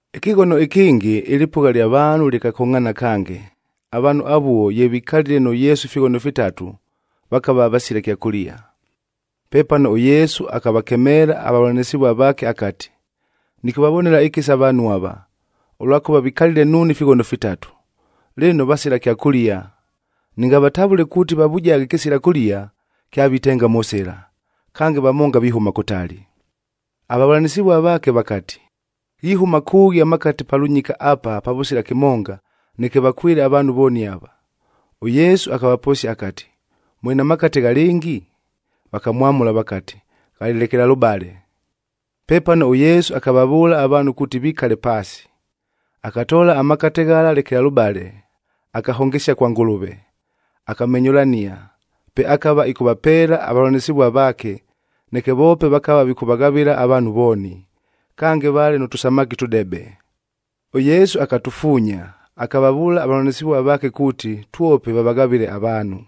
Ɨkɨghono ɨkɨngɨ, ɨlɨpʉgha lya vaanhu lɨkakongʼhaana kange. Avaanhu avuo ye vikalile nʉ Yesu ifighono fitatu, vakava vasila kyakʉlia. Pepano ʉYesu akavakemeela avavʉlanɨsɨvua vaake akati, “Nɨkʉvavonela ɨkɨsa avaanhu ava, ʉlwakʉva vikalile nuune ifighono fitatu, lɨno vasila kyakʉlia. Nɨngavatavʉle kuuti vavujaghe kɨsila kʉlia, kyavitenga mʉ sɨla, kange vamonga vihʉma kʉtali.” Avavʉlanɨsɨvua vaake vakati, “Ghihʉma kʉʉghi amakate pa lʉnyika apa pavʉsila kɨmonga, neke vakwɨle avaanhu vooni ava!” ɄYesu akavaposia akati, “Mʉlɨ na makate ghalɨngi?” Vakamwamʉla vakati, “Ghalɨ lekelalʉbale.” Pepano ʉYesu akavavʉʉla avaanhu kuuti vikale paasi. Akatoola amakate ghala lekelalʉbale, akahongesia kwa Ngʉlʉve. Akamenyʉlania, pe akava ɨkʉvapeela avavʉlanɨsɨvua vaake, neke voope vakava vikʉvaghavɨla avaanhu vooni. Kange, vaale nʉ tʉsamaki tʉdebe. ɄYesu akatʉfuunya, akavavʉʉla avavʉlanɨsɨvua vaake kuuti, twope vavaghavɨle avaanhu.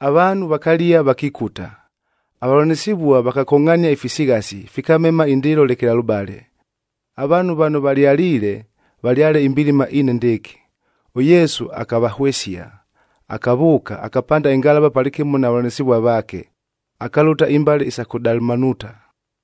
Avaanhu vakalia, vakikuta. Avavʉlanɨsɨvua vakakongʼhania ifisighasi, fikamema indɨɨlo lekelalʉbale. Avaanhu vano valyaliile valyale imbilima ine ndɨɨkɨ. ɄYesu akavahwesia, akavʉʉka, akapanda ɨngalavaa palɨkɨmo na vavʉlanɨsɨvua vaake, akalʉta imbale isa kʉ Dalumanuta.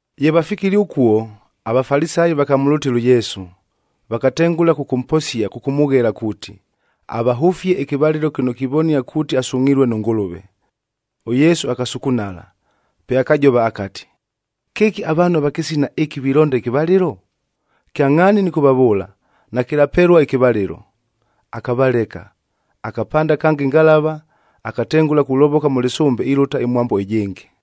Ye vafikile ʉkuo, aVafalisayi vakamʉlʉtɨla ʉYesu, vakatengʉla kʉkʉmposia kʉkʉmʉghela kuuti, avahʉfie ɨkɨvalɨlo kɨno kivonia kuuti asungʼhilue nʉ Ngʉlʉve. ɄYesu akasukunala, pe akajova akati, “Kɨki avaanhu va kɨsina ɨkɨ vilonda ɨkɨvalɨlo? Kyangʼhaani nɨkʉvavʉʉla, nakɨlapelua ɨkɨvalɨlo.” Akavaleka, akapanda kange ɨngalava, akatengʉla kulovoka mʉ lɨsʉmbe ilʉta ɨmwambo ɨjɨngɨ.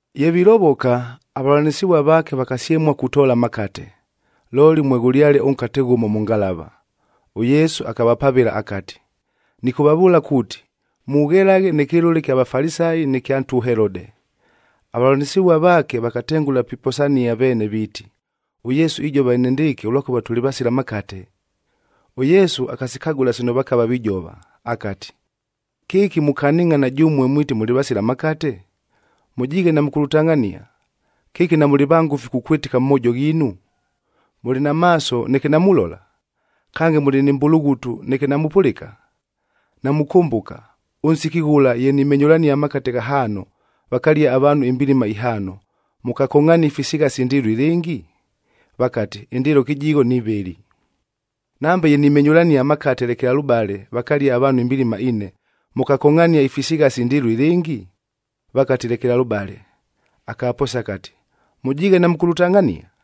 Ye vilovoka, avavʉlanɨsɨvua vaake vakasyemua kutoola amakate, looli mweghʉlyale ʉnkate ghʉmo mʉ ngalava. ɄYesu akavapavɨla akati, “Nɨkʉvavʉʉla kuuti, mughelaghe nɨ kɨlʉleb ɨkya Vafalisayi nɨ kya ntwa ʉHelode.” Avavʉlanɨsɨvua vaake vakatengʉla piposania veene viiti, “ɄYesu ijova enendɨɨkɨ, ʉlwakʉva tʉlɨ vasila makate.” ɄYesu akasikagʉla sino vakava vijova, akati, “Kɨki mukanɨngʼhana jʉmue mwiti mʉlɨ vasila makate? Mʉjiighe namʉkʉlʉtangʼhania! Kɨki namʉlɨ vangʉfi kukwɨtɨka mʉ moojo ghiinu? Mʉlɨ na maaso, neke namulola? Kange, mʉlɨ ni mbulughutu, neke namupʉlɨka? Namukʉmbʉka, ʉnsiki ghʉla ye nimenyʉlania amakate ghahaano, vakalia avaanhu imbilima ihaano, mʉkakongʼhania ifisighasi indɨɨlo ilɨngi?” Vakati, “Indɨɨlo kɨjigho ni vɨlɨ.” “Nambe ye nimenyʉlania amakate lekelalʉbale, vakalia avaanhu imbilima ine, mʉkakongʼhania ifisighasi indɨɨlo ilɨngi?” Vakati, “Lekelalʉbale.” Akavaposia akati, “Mʉjiighe namʉkʉlʉtangʼhania?”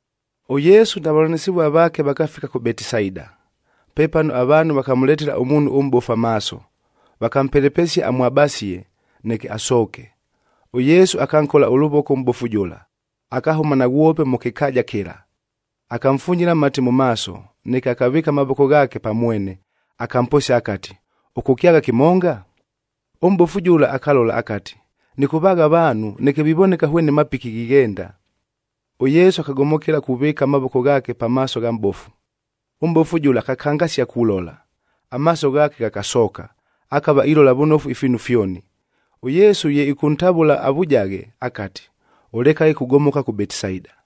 ɄYesu na vavʉlanɨsɨvua vaake vakafika kʉ Betisaida, pepano avaanhu vakamʉletela ʉmuunhu ʉmʼbofu amaaso, vakampelepesia amwabasie, neke asooke. ɄYesu akankola ʉlʉvoko ʉmʼbofu jʉla, akahʉma naghwope mʉ kɨkaaja kɨla. Akamfunyila amati mʉ maaso, neke akavɨɨka amavoko ghaake pa mwene, akamposia akati, “Ʉkʉkyagha kɨmonga?” Ʉmʼbofu jʉla akalola akati, “Nɨkʉvaagha avaanhu, neke vivoneka hwene mapiki ghighenda!” ɄYesu akagomokela kuvɨɨka amavoko ghaake pa maaso gha mʼbofu. Ʉmʼbofu jʉla akakangasia kulola. Amaaso ghaake ghakasooka, akava ilola vʉnofu ifiinu fyoni. ɄYesu ye ɨkʉntavʉla avujaghe, akati, “Ʉlekaghe kugomoka kʉ Betisaida.”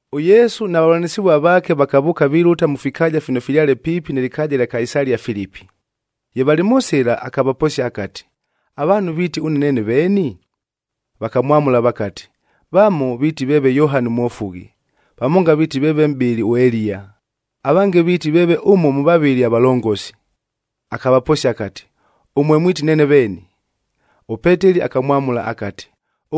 ɄYesu na vavʉlanɨsɨvua vaake, vakavʉʉka vilʉta mʉ fikaaja fino filyale piipi nɨ lɨkaaja lya Kaisalia-Filipi. Ye valɨ mʉ sɨla, akavaposia akati, “Avaanhu viiti ʉne neene veeni?” Vakamwamʉla vakati, “Vamo viiti veeve Yohani ʉMwofughi, vamonga viiti veeve mʼbɨli ʉEliya, avange viiti veeve ʉmo mʉ vavɨli avalongosi.” Akavaposia akati, “Ʉmue mwiti neene veeni?” ɄPeteli akamwamʉla akati,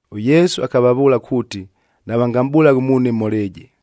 ɄYesu akavavʉʉla kuuti, navangamʼbʉlaghe muunhu ɨmhola ɨjɨ.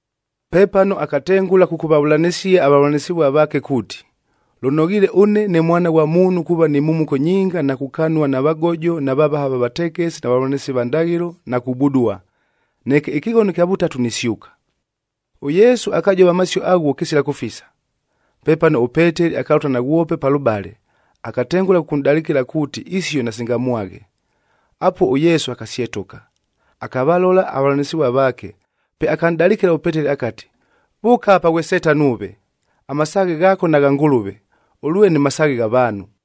Pepano akatengʉla kʉkʉvavʉlanɨsia avavʉlanɨsɨvua vaake kuuti, “Lʉnoghiile ʉne ne Mwana ghwa Muunhu kuuva ni mhumuko nyinga na kukanua na vagojo na vavaha va vatekesi na vavʉlanɨsi va ndaghɨlod na kubudua, neke ɨkɨghono ɨkya vʉtatu nisyʉka.” ɄYesu akajova amasio aghuo kɨsila kʉfisa. Pepano ʉPeteli akalʉta naghwope palʉbale, akatengʉla kʉkʉnʼdalɨkɨla kuuti, isio nasingamwaghe. Apuo ʉYesu akasyetʉka, akavalola avavʉlanɨsɨvua vaake, pe akanʼdalɨkɨla ʉPeteli akati, “Vʉʉka apa ghwe Setano ʉve, amasaaghe ghaako nagha Ngʉlʉve, ʉlwene masaaghe gha vaanhu.”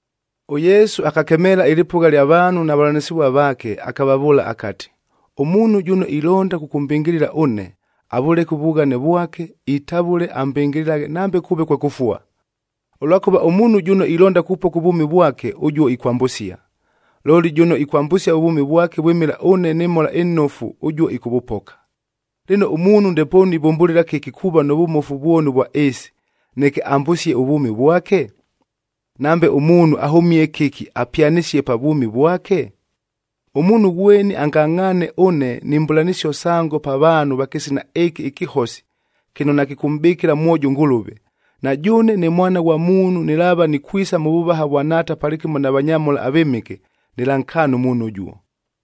ɄYesu akakemeela ɨlɨpʉgha ɨlya vaanhu na vavʉlanɨsɨvua vaake, akavavʉʉla akati, “Ʉmuunhu jʉno ilonda kʉkʉmbɨngɨlɨla ʉne, avʉleke ʉvughane vwake, itavʉle ambɨngɨlɨlaghe nambe kʉʉve kwe kʉfua. Ʉlwakʉva ʉmuunhu jʉno ilonda kupoka ʉvwʉmi vwake, ʉjuo ikwambʉsia, looli jʉno ikwambʉsia ʉvwʉmi vwake vwɨmɨla ʉne nɨ Mhola ɨNofu, ʉjuo ɨkʉvʉpoka. Lɨno, ʉmuunhu ndepoonu ivʉmbʉlɨla kɨki kuuva nʉ vʉmofu vwoni ʉvwa ɨɨsi, neke ambʉsie ʉvwʉmi vwake? Nambe ʉmuunhu ahʉmie kɨki apyanɨsie pa vwʉmi vwake? Ʉmuunhu ghweni angangʼhaane ʉne ni mbʉlanɨsio sango pa vaanhu va kɨsina ɨkɨ ɨkɨhosi, kɨno nakɨkʉmʼbɨkɨla mwojo ʉNgʉlʉve, na jʉʉne ne Mwana ghwa Muunhu, nɨlaava nikwisa mʉ vʉvaha vwa Nhaata palɨkɨmo na vanyamhola avɨmɨke, nɨlankaana ʉmuunhu ʉjuo.”